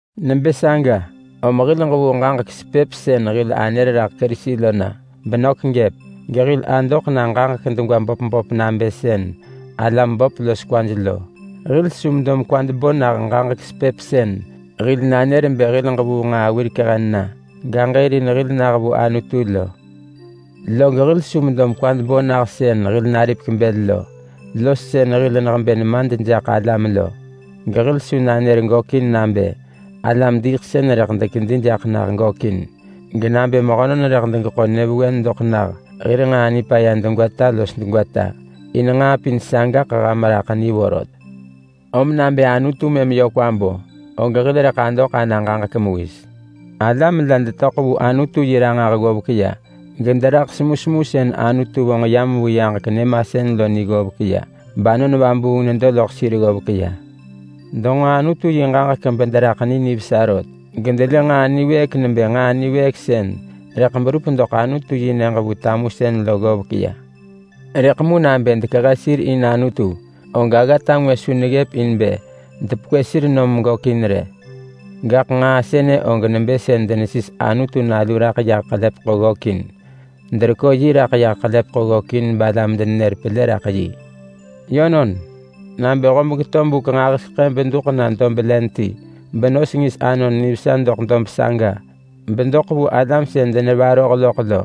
Nebë saga, om hil ġevuu ġaġek sepëp sën hil anër raḳ Kerisi lo na benök gëp, gehil adoḳ na ġaġek degwa böp böp nabë sën alam böp los kwaj lo. Hil su medo mekwad bo nah ġaġek sepëp sën hil nanër bë hil ġevuu nġaa wirek hen na gaġërin hil nah vu Anutu lo. Log hil su medo mekwad bo nah sën hil naripek bël lo, los sën hil nehebë nemad jaḳ alam lo. Gehil su nanër gökin nabë alam-diiḳsën rëḳ dekedi jaḳ nah gökin, genabë mehönon rëḳ degeḳo nyëvewen doḳ nah hir nġaa nipaya degwata los degwata. In nġaa pin sagaḳ ham raḳ ni vorot. Om nabë Anutu mëm yö kwa bo, og hil rëḳ adoḳ ana ġaġek mewis. Alam la detöḳ vu Anutu yi ranġah ggovek ya, gederaḳ semusemu sën Anutu vonġ yam vu yaġek nyëmasën lo ni ggovek ya. BAnon Vabuung nedo loḳ sir ggovek ya. Denġo Anutu yi ġaġek bederaḳ ni nivesa rot, gedelë nġaa niwëëk nebë nġaa niwëëk sën rëḳ berup doḳ Anutu-yi-nyëġ vu tamusën lo ggovek ya. Rëḳ mu nabë dekehe sir in Anutu, og aggata ngwë su neggëp in bë depekwë sir nom gökin rë. Gaḳ nġaa sënë og nebë sën denesis Anutu Nalu raḳ yah ḳelepeḳo ggökin. Derekö yi raḳ yah ggökin balam denenër pelë raḳ yi. Yönon, nabë hob geto buk nġahiseḳë beduḳ na dob len ti benos ngis anon nivesa doḳ dob saga bedoḳ vu alam sën denevaroh loḳ lo,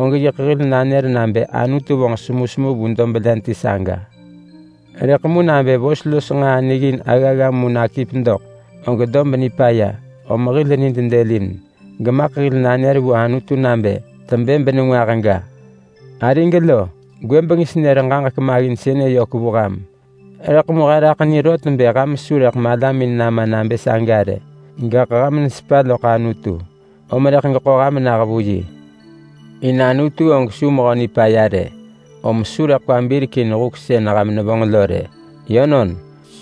og yiḳ hil nanër nabë Anutu vonġ semusemu vu dob len ti saga. Rëḳ mu nabë vos los nġaa niggin aggagga mu nakip doḳ, og dob nipaya, om hil nid dëlin, gemaḳ hil nanër vu Anutu nabë tebë benengwah ga. Arig lo, gwëbeng senër ġaġek maggin sënë yök vu ham. Rëḳ mu he raḳ ni rot bë ham su rëḳ malamin nama nabë saga rë, gaḳ ham nesepa loḳ Anutu, om rëḳ geḳo ham nah vu yi. In Anutu og su mehö nipaya rë, om su rëḳ kwa birek in huk sën ham nevonġ lo rë. Yönon,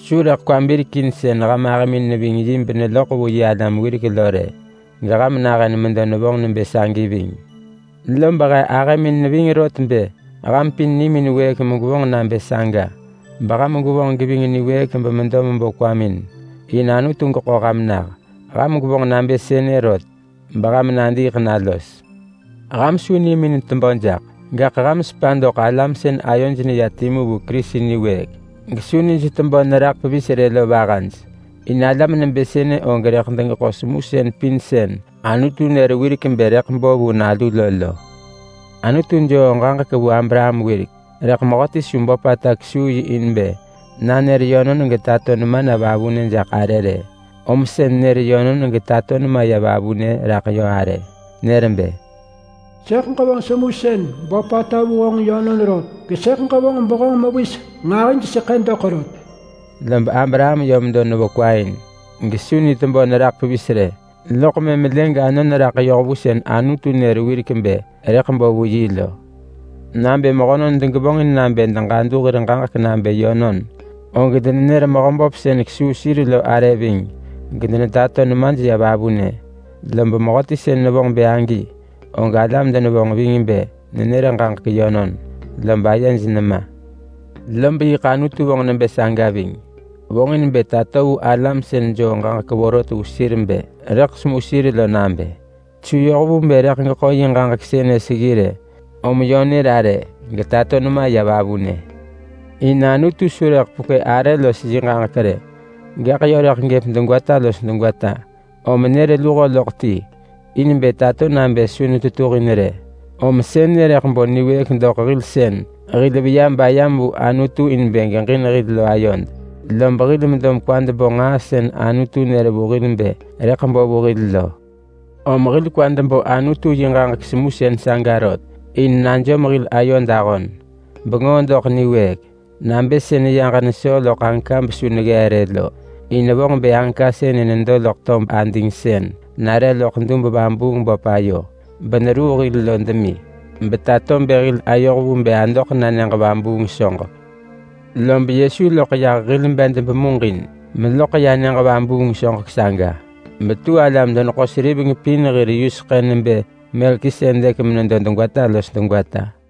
su rëḳ kwa birek in sën ham ahëmin neving yi beneloḳ vu yi alam wirek lo rë. Geham nahën medo nevonġ nebë sagi ving. Lob he ahëmin ving rot bë ham pin nimin wëëk megwevonġ nabë saga, beham gwevonġ geving niwëëk bemedo mebo kwamin in Anutu geḳo ham nah. Ham gwevonġ nabë sënë rot beham nadiiḳ na los. Ham su nimin tebö jaḳ. Gaḳ ham sepa doḳ alam sën ayoj neya timu vu Kerisi niwëëk gesu nij tebö neraḳ pevis rë lo vahaj. In alam nebë sënë og rëḳ degeḳo semusën pin sën Anutu nër wirek bë rëḳ bo vu nalu lo lo. Anutu joo ġaġek vu Abraham wirek, rëḳ mehöti su böpata kesuu yi in bë nanër yönon getato nema na vavunë jaḳ arë rë. Om sën nër yönon getato nema ya vavunë raḳ yö arë. Nër bë, “Sëḳ ġevonġ semusën böpata vu honġ yönon rot, gesëḳ ġevonġ behonġ mewis nġahijseḳë doḳ rot.” Lob Abraham yö medo nevo kwa in gesu ni tebö neraḳ pevis rë. Loḳ mëm lë ganon raḳ yoh vu sën Anutu nër wirek bë rëḳ bo vu yi lo. Nabë mehönon degevonġin nabë deġadu hir ġaġek nabë yönon, og denenër mehöböp sën kesuu sir lo arë ving gedenetato nemaj ya vavunë. Lob mehöti sën nevonġ bë agi, og alam denevonġ ving bë nenër ġaġek yönon lob ayej nema. Lob yiḳ Anutu vonġ nebë saga ving. Vonġin bë tato vu alam sën joo ġaġek vorot vu sir bë rëḳ semu sir lo nabë su yoh vu bë rëḳ geḳo yi ġaġek sënë seggi rë. Om yö nër arë getato nema ya vavunë. In Anutu su rëḳ pekwë arë los yi ġaġek rë, gaḳ yö rëḳ gëp degwata los degwata. Om nër luho loḳ ti in bë tato nabë su netetuhin rë. Om sënë rëḳ bo niwëëk doḳ hil sën hil veya bayam vu Anutu in bë geġin hil lo ayod. Lob hil medo mekwad bo nġaa sën Anutu nër vu hil bë rëḳ bo vu hil lo. Om hil kwad bo Anutu yi ġaġek semusën saga rot, in najom hil ayod ahon bengoo doḳ niwëëk nabë sën yaġ nesoo loḳ anka besu neggee rë lo. In vonġ bë anka sënë nedo loḳ tob ading sën nare loḳ dub-vabuung-böp ayo beneruu hil lo demi, betato bë hil ayoh vu bë adoḳ na nyëġ vabuung soġek. Lob Yesu loḳ yah hil bed bemuġin meloḳ ya nyëġ vabuung soġek saga betu alam-deneḳo-seriveng pin hir yuseḳë nebë Melkisedek menedo degwata los degwata.